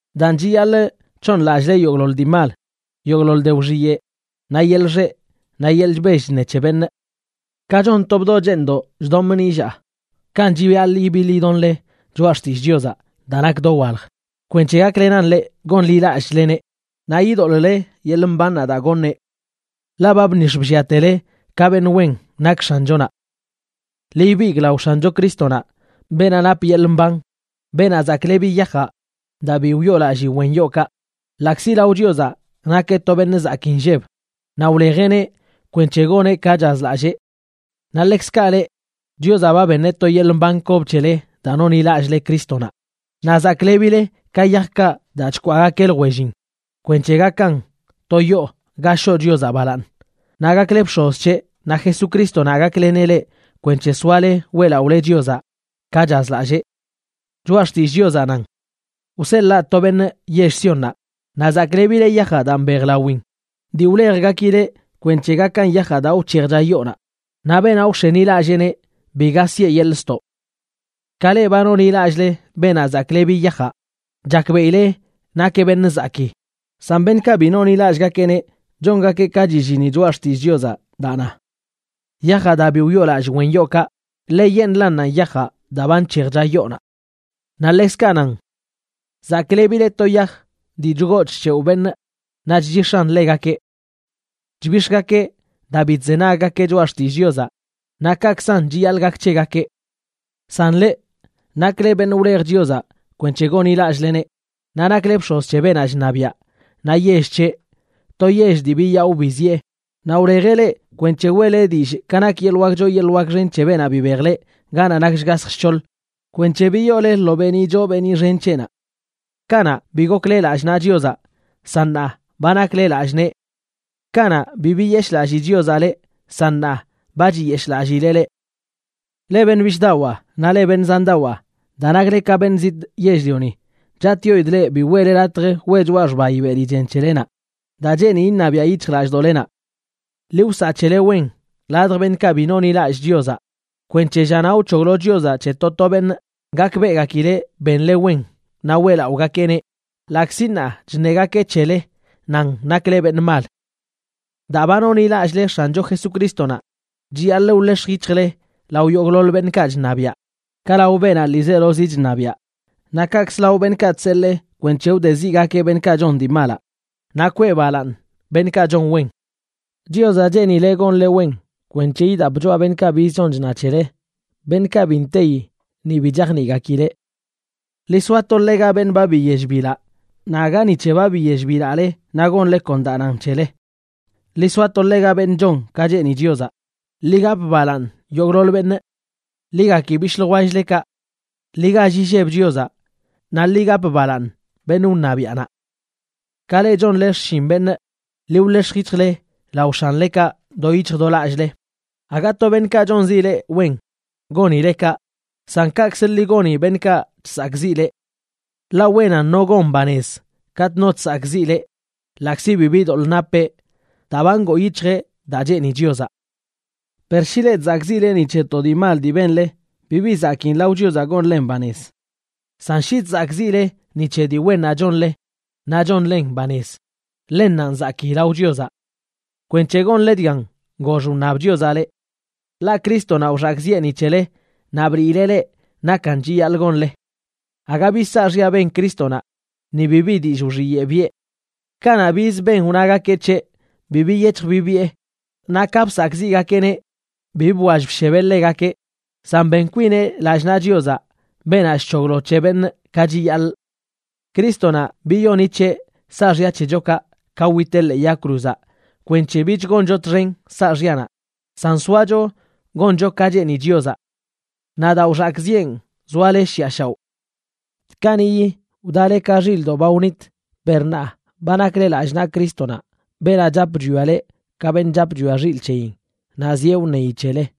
Daan, chiyaḻꞌ c̱hooṉlallꞌle yogꞌḻoḻ dii mal, yogꞌḻoḻ de wxiyeꞌ, naꞌ yeḻꞌ xeꞌ, naꞌ yeḻꞌ chbell chṉe c̱he beṉꞌ. Ka chon to bdoꞌ cheeṉdoꞌ chdomꞌ nillaa, kanꞌ chiyaḻꞌ ibiḻ idonle choꞌa xtillꞌ Chiozaꞌ daa nak dowalj, kwenc̱he gaklenan leꞌ gonḻilallꞌchleneꞌ naꞌ idoḻꞌle yeḻꞌ mbannaꞌ daa goṉeꞌ. Ḻaꞌ ba bnix̱ blliatele ka beṉꞌ wen nak X̱anchonaꞌ. Ḻi ibigꞌ lao X̱ancho Crístonaꞌ, beenaꞌ nap yeḻꞌ mban, beenaꞌ zaklebi yajaꞌ daa bi wyoolallii wen yookaꞌ, ḻaꞌkzi lao Chiozaꞌ nakeꞌ to beṉꞌ zakii nlleb naꞌ wlejeꞌneꞌ kwenc̱he goneꞌ ka chazlallee. Naꞌ ḻekzkaꞌ leꞌ, Chiozaꞌ ba beṉeꞌ to yeḻꞌ mban kob c̱hele daa nonḻilallꞌle Crístonaꞌ, naꞌ zaklebile ka yajkaꞌ daa chkwaagakeꞌ ljwellin kwenc̱he gakan to yoo ga shoꞌ Chiozaꞌ balaaṉ. Naꞌ gakle bx̱oz c̱heꞌ, naꞌ Jesucrístonaꞌ gakleneꞌ leꞌ kwenc̱he soale weꞌlaꞌole Chiozaꞌ ka chazlallee. Choꞌa xtillꞌ Chiozaꞌ nan: Wseḻaa to beṉꞌ yell Siónnaꞌ, naꞌ zaklebileꞌ yajaꞌ daa mbejlawin dii wlejgakileꞌ kwenc̱he gakan yajaꞌ daa wc̱hejcha yoonaꞌ. Naꞌ beenaꞌ wx̱enilalleeneꞌ, biga siꞌe yeḻꞌ ztoꞌ. Ka leꞌ ba nonḻilallꞌle beenaꞌ zaklebi yajaꞌ, chakbeꞌile nakeꞌ beṉꞌ zakii. San beṉꞌkaꞌ bi nonḻilallꞌgakeꞌneꞌ chongakeꞌ ka chillini Choꞌa Xtillꞌ Chiozaꞌ daa na: Yajaꞌ daa bi wyoolallꞌ wen yookaꞌ, ḻeyeṉꞌlannanꞌ yajaꞌ daa ba nc̱hejcha yoonaꞌ. Naꞌ ḻekzkaꞌ nan: Zaklebileꞌ to yaj dii chgoo chc̱hewꞌ beṉꞌ naꞌ chchix̱an ḻegakeꞌ. Chbix̱gakeꞌ daa bi chzenaggakeꞌ choꞌa xtillꞌ Chiozaꞌ, naꞌ kaꞌkzan chiyaḻꞌ gak c̱hegakeꞌ. San leꞌ, nakle beṉꞌ wlej Chiozaꞌ kwenc̱he gonḻilallꞌleneꞌ, naꞌ nakle bx̱oz c̱he beenaꞌ chṉabiaꞌ, naꞌ yell c̱heꞌ, to yell dii biyaꞌo biziꞌe. Naꞌ wlejeꞌ leꞌ kwenc̱he weꞌle dillꞌ ka nak yeḻꞌ wak choo yeḻꞌ wak xen c̱he beenaꞌ bibej leꞌ ganaꞌ nak shgasj shc̱hoḻ kwenc̱he biyoole lo beeniꞌ choo beeniꞌ xen c̱heꞌnaꞌ. Kanaꞌ, bi gokle lallꞌ naꞌ Chiozaꞌ, san ṉaa ba nakle lallꞌ nee. Kanaꞌ, bi biyeshꞌlallii Chiozaꞌ leꞌ, san ṉaa ba chiyeshꞌlallileꞌ leꞌ. Leꞌ beṉꞌ bishꞌdawaa naꞌ leꞌ beṉꞌ zandawaa, daa nakle ka beṉꞌ zitꞌ yell-lioni, chatꞌyoidꞌ leꞌ bi weꞌle latj weꞌ choꞌa xbayi beli chen c̱helenaꞌ daa cheeni iṉabiaꞌ yic̱hjlallꞌdoꞌlenaꞌ. Ḻi wsaꞌ c̱hele wen ladj beṉꞌkaꞌ bi nonḻilallꞌ Chiozaꞌ, kwenc̱he llanaꞌ wc̱hoglo Chiozaꞌ c̱he to to beṉꞌ, gakbeꞌgakileꞌ benle wen naꞌ weꞌlaꞌogakeꞌneꞌ, ḻaꞌkzi ṉaa chṉegakeꞌ c̱hele nan nakle beṉꞌ mal. Daa ba nonḻilallꞌle X̱ancho Jesucrístonaꞌ, chiyaḻꞌ wḻex̱j yic̱hjle lao yogꞌḻoḻ beṉꞌkaꞌ chṉabiaꞌ: ka lao beenaꞌ ḻiizelozi chṉabiaꞌ, naꞌ kaꞌkz lao beṉꞌkaꞌ chseḻee kwenc̱he wdeziꞌgakeꞌ beṉꞌkaꞌ chon dii malaꞌ naꞌ kwee balaaṉ beṉꞌkaꞌ chon wen. Chiozaꞌ cheenileꞌ gonle wen kwenc̱he idap choꞌa beṉꞌkaꞌ biz chon chna c̱hele, beṉꞌkaꞌ bi nteyi ni bi chajniꞌgakileꞌ. Ḻi soato ḻega beṉꞌ ba biyell bilaꞌ, naꞌ aga ni c̱he ba biyell bilaꞌle naꞌ gonle kon daa nan c̱hele. Ḻi soato ḻega beṉꞌ chon ka cheeni Chiozaꞌ. Ḻi gap balaaṉ yogꞌḻoḻ beṉꞌ. Ḻi gaki bishꞌ ljwell-lekaꞌ. Ḻi gall illeb Chiozaꞌ. Naꞌ ḻi gap balaaṉ beṉꞌ wṉabiaꞌnaꞌ. Ka leꞌ chonle xshin beṉꞌ, ḻi wḻex̱j yic̱hjle lao x̱anlekaꞌ do yic̱hj do lallꞌle. Aga to beṉꞌkaꞌ chonzi leꞌ wen gonile kaꞌ, san kaꞌkzə ḻi goni beṉꞌkaꞌ chsakꞌziꞌ leꞌ. Ḻaꞌ wenan no gon banez katꞌ no chsakꞌziꞌ ḻeꞌ ḻaꞌkzi bibi doḻꞌ napeꞌ daa ba ngoo yic̱hjeꞌ daa cheeni Chiozaꞌ. Per shi leꞌ chzakꞌziꞌle ni c̱he to dii mal dii benle, bibi zakiin lao Chiozaꞌ gonlen banez. San shi chzakꞌziꞌle ni c̱he dii wennaꞌ chonle naꞌ chonlen banez, ḻennanꞌ zakii lao Chiozaꞌ. Kwenc̱he gonle dgan gox wṉab Chiozaꞌ leꞌ. Ḻaꞌ Crístonaꞌ wxakꞌziꞌe ni c̱hele naꞌ bliileꞌ leꞌ nakan chiyaḻꞌ gonle. Aga bi saaxya ben Crístonaꞌ, ni bibi dillꞌ wxiyeꞌ biꞌe. Kanaꞌ biz ben wnagakeꞌ c̱heꞌ, bi biyec̱hj bibiꞌe, naꞌ ka bsakꞌziꞌgakeꞌneꞌ bi bwall bshebeꞌ ḻegakeꞌ, san ben kwineꞌ lallꞌ naꞌ Chiozaꞌ, beenaꞌ chc̱hoglo c̱he beṉꞌ ka chiyaḻꞌ. Crístonaꞌ biyoni c̱heꞌ saaxya c̱hechokaꞌ ka witeꞌ ḻee yag cruzaꞌ kwenc̱he bich goncho txen saaxyanaꞌ, san soacho goncho ka cheeni Chiozaꞌ. Naꞌ daa wxakꞌziꞌen, zoale shiꞌa shaoꞌ. Kaniꞌyi wdale ka xilꞌdoꞌ ba wnit. Per ṉaa ba nakle lallꞌ naꞌ Crístonaꞌ, beenaꞌ chap chwia leꞌ ka beṉꞌ chap chwia xilꞌ c̱heyin, naꞌ zieꞌ wṉeyi c̱hele.